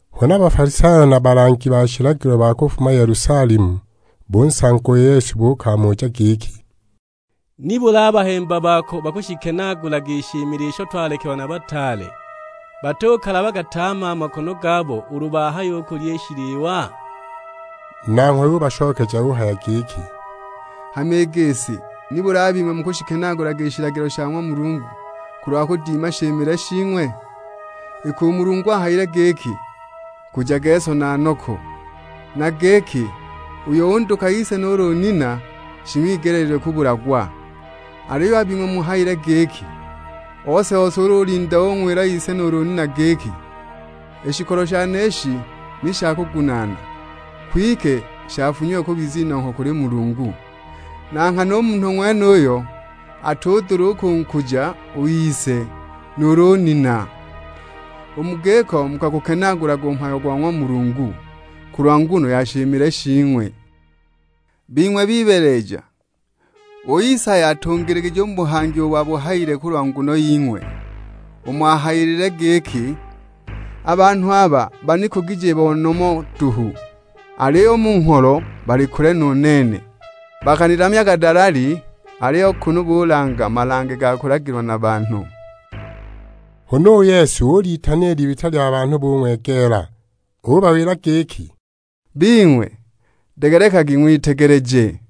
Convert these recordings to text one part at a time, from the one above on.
Huna Bafalisayo na balangi ba shilagilo ba kufuma Yelusalemu, bunsanga u Yesu kumuja giki, "Nibuli a bahemba bako bakushikenaagulaga i shimile isho twalekelwa na bataale, batukalabaga tame a makono gabo ulu bahaya kulya i shiliwa?" Nanghwe ubashokeja uhaya giki, "Hama i gisi, nibuli a bing'we mukashikenaagulaga i shilagilo sha ng'wa Mulungu kulwa kudima shimile shing'we? Iki u Mulungu ahayile giki, 'Nkujage so na noko'; na giki, 'Uyo unduka ise nuulu nina shing'wigeleelilwe kubulagwa!' Aliyo a bing'we muhayile giki, ose-ose ulu ulinda ung'wila ise nuulu nina giki, 'I shikolo shane ishi ni shakugunaana, kwike shafunyiwe kubiza inongho kuli Mulungu!' Na nghana u munhu ng'wenuyo atudula u kunkuja u ise nuulu u nina. U mu giko mukagukenaagulaga u mhayo go ng'wa Mulungu kulwa nguno ya shimile shing'we! Bing'we bibeeleja, u Isaya atungiligije u mu buhangi ubo abuhayile kulwa nguno ying'we; umo ahayilile giki, 'A banhu aba banikugije bo ha nomo duhu, aliyo u mu ngholo bali kule nu nene. Bakanilamyaga dalali, aliyo kunu bulanga malange ga kulagilwa na banhu.' " Huna u Yesu ulitana i libita lya banhu bung'wegeela; ubawila giki, "Bing'we, degelekagi ng'witegeleje.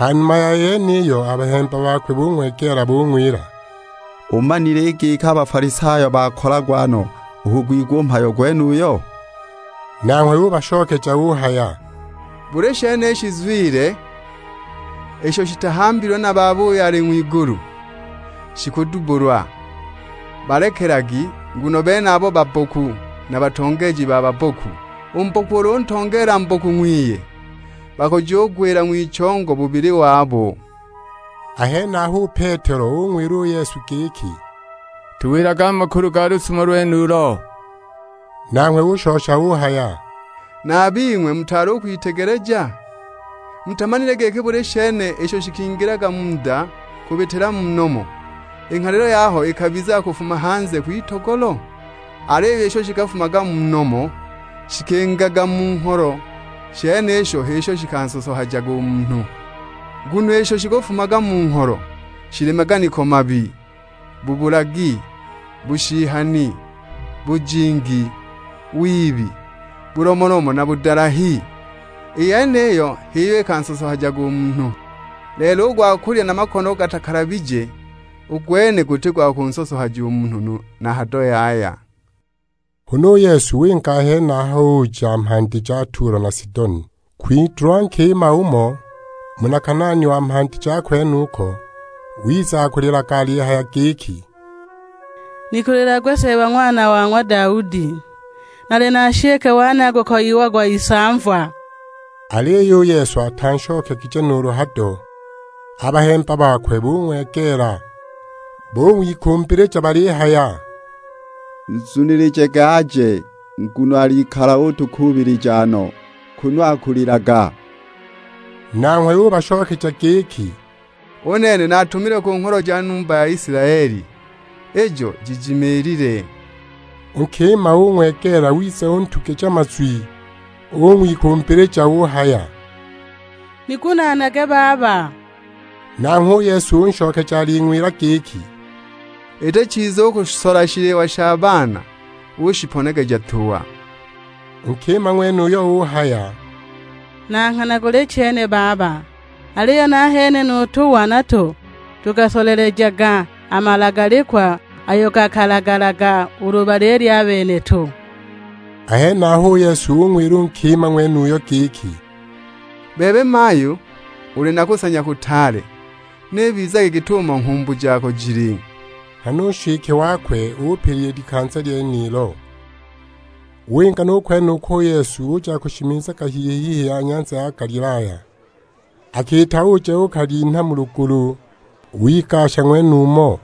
Ha numa ya yeniyo, a bahemba bakwe bung'wegeela bung'wila, "Umanile i giki a Bafalisayo bakolagwa no u kugwigwa u mhayo gwenuyo?" Nanghwe ubashokeja uhaya, "Buli shene i shizwile, isho shitahambilwe na Baba uyo ali ng'wigulu, shikudubbulwa. Balekagi; nguno a benabo babboku, na batongeeji ba babboku. U mboku ulu untongeela mboku ng'wiye, bakujugwila ng'wichongo bubili wabo!" A henaho u Petelo ung'wila u Yesu giki, "Tuwilage a makulu ga lusumo lwenulo." Nanghwe ushosha uhaya, "Na a bing'we mutaali u kwitegeleja? Mutamanile giki buli shene isho shikingilaga mu nda kubitila mu nomo, i nghalilo yaho ikabizaga kufuma hanze kwitogolo? Aliyo isho shikafumaga mu nomo, shikingaga mu ngholo. I shenisho h'isho shikansosohajaga u munhu! Nguno isho shikafumaga mu ngholo, shili maganiko mabi, bubulagi, bushihani, bujingi, wibi, bulomolomo na budalahi. I yeniyi h'iyo ikansosohajaga u munhu; lelo u gwa kulya na makono gatakalabije, u gwene guti gwa kunsosohaja munhu na hado yaya." Huna u Yesu winga a henaho, uja mhandi ja Tulo na Sidoni. Kwitulwa nkima umo, muna Kanaani wa mhandi ja kwenuko, wiza akulilaga alihaya giki, "Nikulilagwe Seeba Ng'wana wa ng'wa Daudi, nali na nshike wane akukoyiagwa isamva!" Aliyo u Yesu atanshokegije nuulu hado; a bahemba bakwe bung'wegeela bung'wikumbilija balihaya, "Nzunilijage aje, nguno alikala utukuubilija no, kunu akulilaga!" Nanghwe ubashokeja giki, "U nene natumilwe ku ngholo ja numba ya Isilaeli, ijo jijimiilile." U nkima ung'wegeela wiza untugija mazwi, ung'wikumbilija uhaya, "Nigunaanage baba!" Nanghwe u Yesu unshokeja aling'wila giki, "Iti chiza u kusola shiliwa sha baana ushiponegeja tuwa." U nkima ng'wenuyo uhaya, "Na nghana guli chene baba, aliyo nahene nu tuwa nato tukasolelejaga a malagalikwa ayo gakalagalaga ulu balilya a beneto." A henaho u Yesu ung'wila u nkima ng'wenuyo giki, "Bebe mayu, uli na kusanya kutaale. N'ibizage git'umo nghumbu jako jili." Nghana u nshike wakwe upila i likanza lyenilo. Winga nu kwenuko u Yesu, uja akushimizaga hihi-hihi ya nyanza ya Galilaya. Akiita uja uukalinha mu lugulu, wigasha ng'wenumo.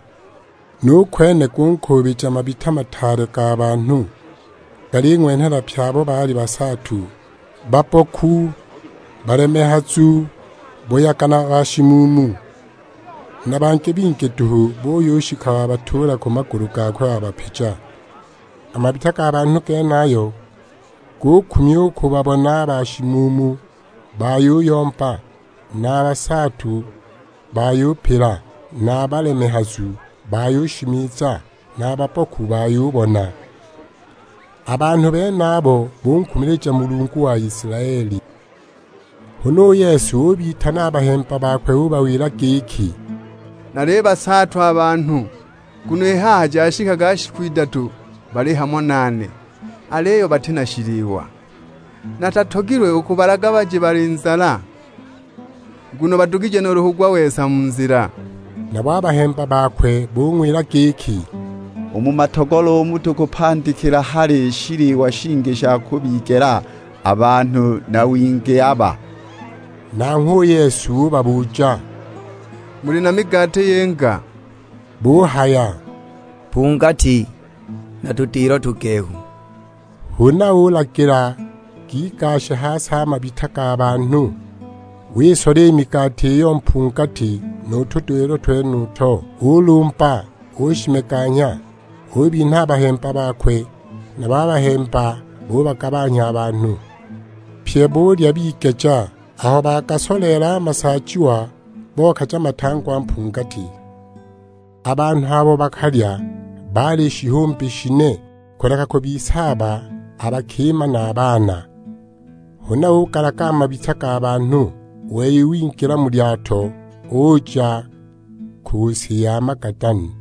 Nu kwene gunkuubija mabita mataale ga banhu, galing'wenhela pye abo baali basaatu, babboku, balemehazu, buyaga na bashimuumu. Na bangi bingi duhu, buyushika babatuula ku magulu gakwe wabapija. A mabita ga banhu genayo, gukumya u kubabona a bashimuumu bayuyomba, na a basaatu bayupila, na a balemehazu bayushimiza, na a babboku bayubona. A banhu benabo bunkumilija Mulungu wa Isilaeli. Huna u Yesu ubitana a bahemba bakwe ubawila giki, "Nalibasaatwa a banhu nguno i haha jashikaga shiku idatu bali hamo nane, aliyo bati na shiliwa. Natatogilwe u kubalaga baje bali nzala, nguno badugije nuulu kugwa-wesa mu nzila." Nabo a bahemba bakwe bung'wila giki, "U mu matogolo umu tukapandikile hali shiliwa shingi sha kubigela a banhu na wingi aba?" Nanghwe u Yesu ubabuja, "Muli na migati yinga?" Buhaya, "Mpungati, na tudilo tugehu." Huna ulagila gigashe ha si a mabita ga banhu. Wisola i migati iyo mpungati nu tudilo twenuto; ulumba, ushimeganya. Ubinha a bahemba bakwe, nabo a bahemba bubagabanhya a banhu. Pye bulya bigeja; aho bagasoleela a masaajiwa, bokaja matangwa mpungati. A banhu abo bakalya baali shihumbi shine, kuleka kubisaaba a bakima na a baana. Huna ugalaga a mabita ga banhu, u wei wingila mu lyato, uja ku si ya Magadani.